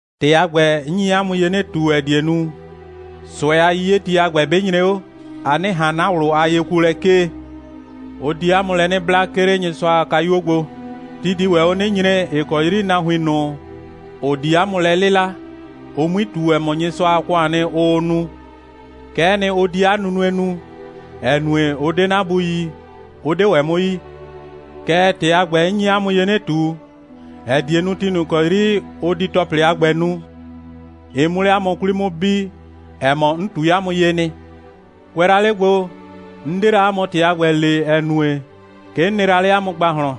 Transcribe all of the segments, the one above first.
‑Tɩ a ‑gbɛ, 'n nyi 'a mʋ ye 'nɩ ꞊tu, ‑ɛ die nu, ꞊sʋɛ a 'yiyeti a ‑gbɛ 'bɩ nyre 'o, a 'nɩ ꞊han 'na ꞊wlʋ a yekuolɛ 'kee. Ʋ di 'a mʋ lɛ 'nɩ bla, 'ke 'le Nyɩsʋa a kayuo gbo. Ti di ‑wɛ 'o 'nɩ nyre, ‑ɩ kɔ 'yri nahuin ꞊nʋ, ‑ʋ di 'a mʋ lɛ 'lɩla, ʋ 'mui ꞊tu, ‑ɛ mɔ, Nyɩsʋa a ‑kʋaan nɩ, ʋʋ nu. Kɛ'ɛ nɩ, ʋ di 'a nunue nu, ‑ɛ nue, ʋ 'de 'na Bu yi, 'ʋ 'de ‑wɛ 'mʋ yi. Kɛɛ, ‑tɩ a ‑gbɛ, 'n nyi 'a mʋ ye 'nɩ ꞊tu, ‑ɛ die nu, ti ꞊nʋ ‑kɔ 'yri ʋ di ‑tɔplɩ a ‑gbɛ nu, ɩ 'mʋ 'le 'a mʋ 'kwli 'mʋ bi, ‑ɛ mɔ, 'n ꞊tui 'a mʋ ye nɩ.» «Kʋɛ la 'le gbo, 'n 'de la 'a mʋ ‑tɩ a ‑gbɛ le, ‑ɛ nue, 'ke 'n nɩ la 'le 'a mʋ ‑gbahlɔn.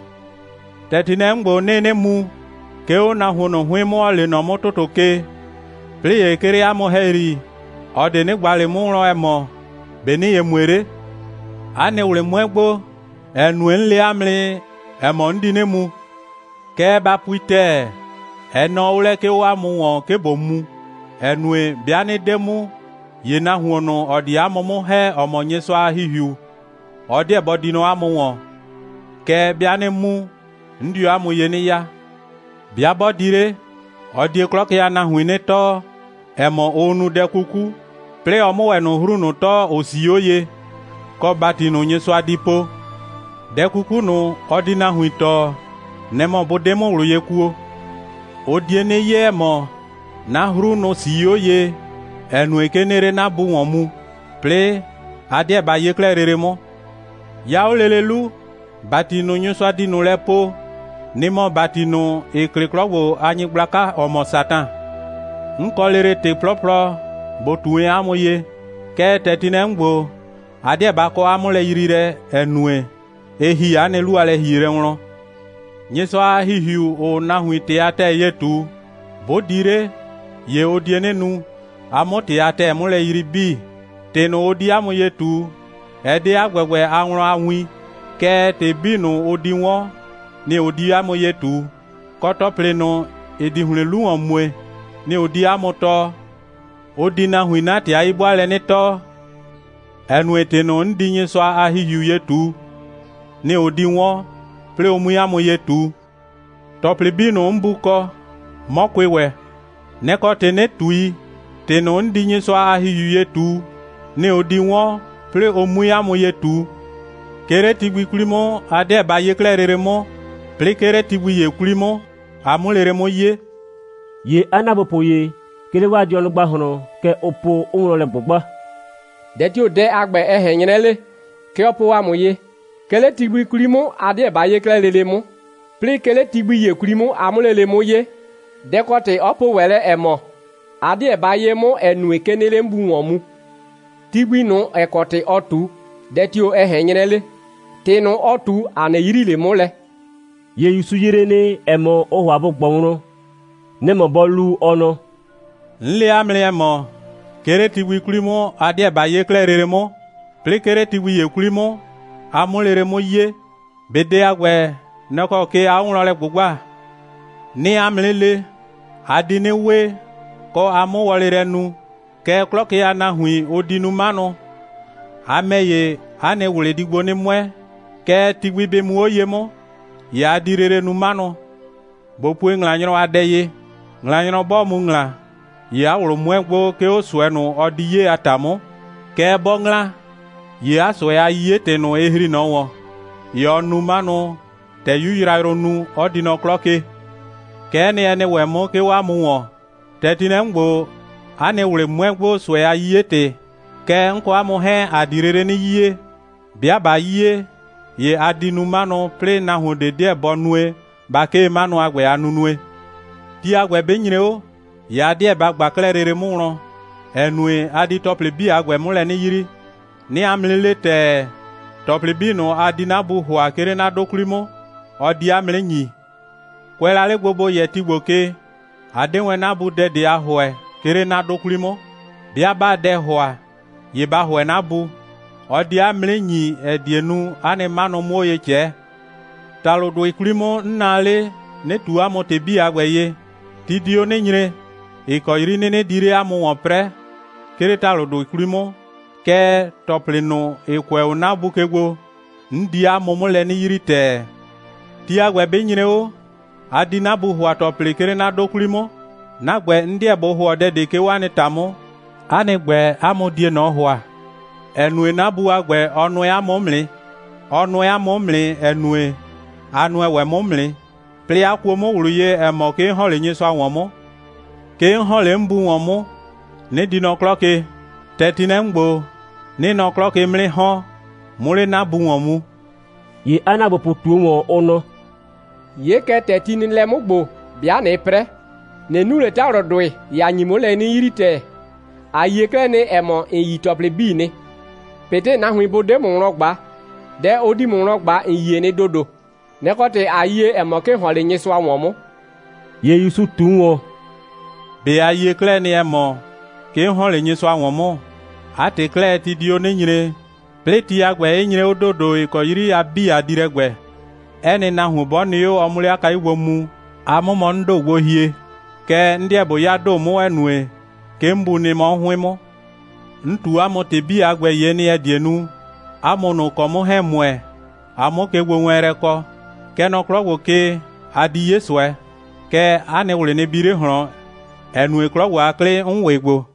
‑Tɛ ti nɩ lɛ 'mʋ ‑gbo, 'nɩɩ 'nɩ mu, 'ke 'o nahuon ꞊nʋ 'hʋɩn 'mʋ, ‑ɔ lee nɔ 'mʋ ‑tʋtʋ ke, 'plɩɩ ‑ye 'ke 'le 'a mʋ ‑hɛyri, ꞊ɔ ꞊de 'nɩ ꞊gba ꞊le 'mʋ wlɔn, ‑ɛ mɔ: ‑Be' ‑nɩɩ ye mue 'le? 'A nɩ ꞊wlɩ 'mʋɛ gbo, ‑ɛ nue, 'n le 'a mʋ nɩ, ‑ɛ mɔ, 'n di 'nɩ mu. Kɛɛ, ba pui ‑tɛɛ, ɛ nɔɔ 'o lɛ, 'ke 'o 'a mʋ ‑wɔn, 'ke ꞊bo mu, ‑ɛ nue, 'bɩa 'nɩ 'de mu, ‑ye nahuon ꞊nʋ, ‑ɔ di 'a mʋ 'mʋ ‑hɛ, ‑ɔ mɔ Nyɩsʋa a ‑Hihiu, ɔ 'deɛ bɔ di nɔ 'a mʋ ‑wɔn. Kɛɛ, 'bɩa 'nɩ mu, 'n dio 'a mʋ ye 'nɩ ya. 'Bɩa 'bɔ di 'le, ɔ die 'klɔ ke a nahuin 'nɩ tɔɔ, ‑ɛ mɔ, ʋʋ nu dɛ 'kuku, 'plɩɩ ɔ 'mʋ ‑wɛ ꞊nʋ 'hru ꞊nʋ tɔɔ, ‑ʋ 'sii 'o ye, kɔ ‑bati ꞊nʋ, Nyɩsʋa di po. Dɛ 'kuku ꞊nʋ, ɔ di nahuin tɔɔ, nɛ‑ mɔ bʋ 'de 'mʋ ꞊wlʋ ye kuo. Ʋ die 'nɩ 'ye, ‑ɛ mɔ, 'na 'hru, nʋ‑ 'sii 'o ye, ‑ɛ nue, 'ke 'nɩɩ 'le 'na Bu ‑wɔn mu, 'plɩɩ a 'deɛ ba 'ye 'klɛɛ lele 'mʋ. 'Ya 'o lele 'lu, ‑bati ꞊nʋ, Nyɩsʋa di ꞊nʋ lɛ poo, nɩ‑ mɔ ‑bati ꞊nʋ, ‑ɩ klɩ 'klɔ ‑gbo a nyɩgblaka, ‑ɔ mɔ Satan. 'N kɔ lele ‑tɩ 'plɔplɔ ꞊bo ꞊tu wɛn 'a mʋ ye, kɛɛ, ‑tɛ ti nɩ lɛ 'mʋ ‑gbo, a 'deɛ ba kɔ 'a 'mʋlɛyriilɛ, ‑ɛ nue, ɩ ‑hi 'a nɩ 'lu a lɛ‑hielɛ wlɔn. Nyɩsʋa a ‑Hihiu, ‑ʋʋ nahuin ‑tɩ a ‑tɛɛ ye ꞊tu, 'bʋ di 'le, ‑ye ʋ die 'nɩ nu, a 'mʋ ‑tɩ a ‑tɛɛ 'mʋ lɛ yrii 'bii. ‑Tɩ ꞊nʋ, ʋ di 'a mʋ ye ꞊tu, ɛ 'de 'a ‑gbɛgbɛ a wlɔn a win, kɛɛ, ‑tɩ 'bii ꞊nʋ, ʋ di 'wɔn, nɩ‑ ʋ di 'a mʋ ye ꞊tu, kɔ, ‑tɔplɩ ꞊nʋ, ‑ɩ di ‑hlɩn 'lu ‑wɔn mue, nɩ‑ ʋ di 'a mʋ tɔɔ. Ʋ di nahuin 'na ‑tɩ a 'yi'bʋaalɛ 'nɩ tɔɔ, ‑ɛ nue, ‑tɩ ꞊nʋ, 'n di Nyɩsʋa a ‑Hihiu ye ꞊tu, nɩ‑ ʋ di 'wɔn, 'plɩɩ ʋ 'mui 'a mʋ ye ꞊tu. ‑Tɔplɩ 'bii, 'n Bu kɔ, 'mɔ kʋɩ ‑wɛ. Nɛ‑ kɔ ‑tɩ, 'nɩ ꞊tui, ‑tɩ ꞊nʋ, 'n di Nyɩsʋa a ‑Hihiu ye ꞊tu, nɩ‑ ʋ di 'wɔn, 'plɩɩ ʋ 'mui 'a mʋ ye ꞊tu.» «'Ke 'le ti gbi 'kwli 'mʋ, a 'deɛ ba 'ye 'klɛɛ lele 'mʋ, 'plɩɩ 'ke 'le ti gbi ‑ye 'kwli 'mʋ, a 'mʋ lele 'mʋ 'ye.» ‑Ye 'a ‑naagbopʋ ‑ye, 'ke 'le 'waa dɩɔnʋ ‑gbahlɔn, kɛ ʋʋ po, 'ʋʋ wlɔn lɛ ꞊gbʋgba: «Dɛ tio‑ dɛ a ‑gbɛ, ɛ ꞊hɛn 'nyrɛ 'le? Kɛ ɔ po ‑a mʋ ye: 'Ke 'le ti gbi 'kwli 'mʋ, a 'deɛ ba 'ye 'klɛɛ lele 'mʋ, 'plɩɩ 'ke 'le ti gbi ‑ye 'kwli 'mʋ, a 'mʋ lele 'mʋ 'ye. Dɛ‑ kɔ ‑tɩ 'ɔ po ‑wɛ lɛ, ‑ɛ mɔ: A 'deɛ ba 'ye 'mʋ, ‑ɛ nue, 'ke 'nɩɩ 'le 'n Bu ‑wɔn mu. Ti gbi ꞊nʋ, ‑ɛ kɔ ‑tɩ ɔɔ ꞊tu, dɛ tio‑ ɛ ꞊hɛn 'nyrɛ 'le? ‑Tɩ ꞊nʋ, ɔɔ ꞊tu, ‑a 'nɩ yrii ꞊le 'mʋ lɛ.» ‑Ye ‑Yusu yree nɩ, ‑ɛ mɔ, ʋʋ ‑hʋa bʋ ꞊gbɔ wlɔn. Nɛ‑ mɔ bɔ lu, ɔ nɔ: «'N le 'a mʋ nɩ, ‑ɛ mɔ: 'Ke 'le ti gbi 'kwli 'mʋ, a 'deɛ ba 'ye 'klɛɛ lele 'mʋ, 'plɩɩ 'ke 'le ti gbi ‑ye 'kwli 'mʋ, a 'mʋ lele 'mʋ 'ye. ꞊Be dɛ a ‑gbɛ, nɛ‑ kɔ ke aa 'o wlɔn lɛ ꞊gbʋgbaa? 'Nɩɩ 'a mʋ 'nɩ le: A di 'nɩ we, kɔ, a 'mʋ wɔlɩ lɛ nu, kɛɛ, 'klɔ ke a nahuin, ʋ di nu 'manʋ. A ‑mɛ ‑ye, 'a nɩ ꞊wlɩ di gbo 'nɩ 'mʋɛ, kɛɛ, ti gbi 'bɩ muu 'o ye 'mʋ, ‑ye a di lele nu 'manʋ. ꞊Bo pue ‑ŋlanyrɔ a dɛ ye: ‑Ŋlanyrɔ 'bɔɔ mu ‑ŋla, ‑ye 'a ꞊wlʋ 'mʋɛ gbo, 'ke 'o ꞊sʋɛ ꞊nʋ, ɔ di 'ye a ‑ta 'mʋ. Kɛɛ, 'bɔ ‑ŋla, ‑ye 'a ꞊sʋɛ a 'yiye‑tɩ ꞊nʋ, ɩ ‑hri ꞊nɔ ‑wɔn. ‑Ye ɔɔ nu 'manʋ, ‑tɛ 'yu yrayrʋ nu, 'ɔ di nɔ 'klɔ ke. Kɛ'ɛ nɩ, ɛ nɩ ‑wɛ 'mʋ, 'ke 'o 'a mʋ ‑wɔn. ‑Tɛ ti nɩ lɛ 'mʋ ‑gbo, 'a nɩ ꞊wlɩ 'mʋɛ gbo, ꞊sʋɛ a 'yiye‑tɩ. Kɛɛ, 'n kɔ 'a mʋ 'hɛɛn, ‑a di lele 'nɩ 'yiye. 'Bɩa ꞊ba 'yiye, ‑ye a di nu 'manʋ, 'plɩɩ nahuon ꞊de 'deɛ bɔ nue, ba 'kee 'manʋ a ‑gbɛ a nunue. Ti a ‑gbɛ 'bɩ nyre 'o, ‑ye a 'deɛ ba ꞊gba 'klɛɛ lele 'mʋ wlɔn, ‑ɛ nue, a di ‑tɔplɩ 'bii a ‑gbɛ 'mʋ lɛ 'nɩ yrii. 'Nɩɩ 'a mʋ 'nɩ le ‑tɛɛ, ‑tɔplɩ 'bii ꞊nʋ, a di 'na Bu ‑hʋa, 'ke 'le 'na 'dʋ 'kwli 'mʋ, ɔ di 'a mʋ 'nɩ ‑nyi. Kʋɛ la 'le gbo, ‑bo yɛ ti ‑gbo ke, a 'de wɛn 'na Bu dɛ ꞊de a ‑hʋɛ, 'ke 'le 'na 'dʋ 'kwli 'mʋ. 'Bɩa 'baa dɛ ‑hʋa, ‑ye ba ‑hʋɛ 'na Bu. Ɔ die 'a mʋ 'nɩ ‑nyi, ‑ɛ die nu, 'a nɩ 'manʋ 'mʋ 'o ye ꞊cɛɛ.» «‑Talʋdʋɩ 'kwli 'mʋ, 'n naa 'le, 'nɩ ꞊tu 'a mʋ ‑tɩ 'bii a ‑gbɛ ye. Ti di 'o 'nɩ nyre, ‑ɩ kɔ 'yri 'nɩnɩ di 'le 'a mʋ ‑wɔn 'prɛɛ, 'ke 'le ‑talʋdʋɩ 'kwli 'mʋ, kɛɛ, ‑tɔplɩ ꞊nʋ, ‑ɩ kʋɛ 'o 'na Bu ke gbo, 'n di 'a mʋ 'mʋ lɛ 'nɩ yrii ‑tɛɛ. Ti a ‑gbɛ 'bɩ nyre 'o, a di 'na Bu ‑hʋa ‑tɔplɩ, 'ke 'le 'na 'dʋ 'kwli 'mʋ. 'Na ‑gbɛ, 'n 'deɛ ꞊bo ‑hʋɔ dɛ ꞊de, 'ke 'o 'a nɩ ‑ta 'mʋ, 'a nɩ ‑gbɛ, 'a mʋ die ꞊nɔ ‑hʋa, ‑ɛ nue, 'na Bu a ‑gbɛ, ɔ nʋɛ 'a mʋ 'mʋ nɩ. Ɔ nʋɛ 'a mʋ 'mʋ nɩ, ‑ɛ nue, a nʋɛ ‑wɛ 'mʋ 'mʋ nɩ, 'plɩɩ 'a kuo 'mʋ ꞊wlʋ ye, ‑ɛ mɔ, 'ke 'n ‑hɔn 'le Nyɩsʋa ‑wɔn 'mʋ. 'Ke 'n ‑hɔn 'le 'n Bu ‑wɔn 'mʋ, 'nɩ di nɔ 'klɔ ke. ‑Tɛ ti nɩ lɛ 'mʋ ‑gbo, 'nɩɩ nɔ 'klɔ ke 'mʋ 'nɩ ‑hɔn, 'mʋ 'le 'na Bu ‑wɔn mu.» ‑Ye 'a ‑naagbopʋ ꞊tuo ‑wɔn, ʋ nɔ: «'Ye kɛ, ‑tɛ ti nɩ lɛ 'mʋ ‑gbo, 'bɩa ꞊nɩɩ 'prɛ, ꞊nɩ nu ꞊le ‑talʋdʋɩ, ‑ye ‑a nyi 'mʋ lɛ 'nɩ yrii ‑tɛɛ. ‑A yie 'klɛɛ nɩ, ‑ɛ mɔ, ‑n yi ‑tɔplɩ 'bii nɩ. ꞊Betɩ nahuin bʋ 'de ‑mʋ wlɔn ꞊gba, dɛ ʋ di ‑mʋ wlɔn ꞊gba, ‑n yie nɩ ‑dodo. Nɛ‑ kɔ ‑tɩ, ꞊a yie, ‑ɛ mɔ, 'ke ‑n ‑hɔn 'le Nyɩsʋa ‑wɔn 'mʋ.» ‑Ye ‑Yusu ꞊tu ‑wɔn: «꞊Be a yie 'klɛɛ nɩ, ‑ɛ mɔ, 'ke 'n ‑hɔn 'le Nyɩsʋa ‑wɔn 'mʋ? 'A ‑tɩ 'klɛɛ, ti di 'o 'nɩ nyre, 'plɩɩ ti a ‑gbɛ 'ɩ nyre 'o ‑dodo, ‑ɩ kɔ 'yri a 'bii, a di lɛ ‑gbɛ, 'ɛ nɩ nahuon 'bɔ nɩ 'o, ɔ 'mʋ 'le 'a kayu gbo mu, a 'mʋ mɔ 'n ‑do gbo hie. Kɛɛ, 'n 'deɛ ꞊bo 'ya ‑do 'mʋ, ‑ɛ nue, kɛ 'n Bu nɩ mɔ 'mʋ 'hʋɩn 'mʋ. 'N ꞊tu 'a mʋ ‑tɩ 'bii a ‑gbɛ ye nɩ, ‑ɛ die nu, 'a mʋ ꞊nʋ, ‑ʋ kɔ 'mʋ 'hɛɛn‑ ‑mʋɛ, a 'mʋ kegbowɛɛnlɛ kɔ. Kɛ nɔ 'klɔ ‑gbo ke, a di 'ye ꞊sʋɛ. Kɛɛ, 'a nɩ ꞊wlɩ nɩ bi 'le ꞊hlɔn, ‑ɛ nue, 'klɔ ‑gbo a 'klɩ, 'n ‑wɩ gbo.»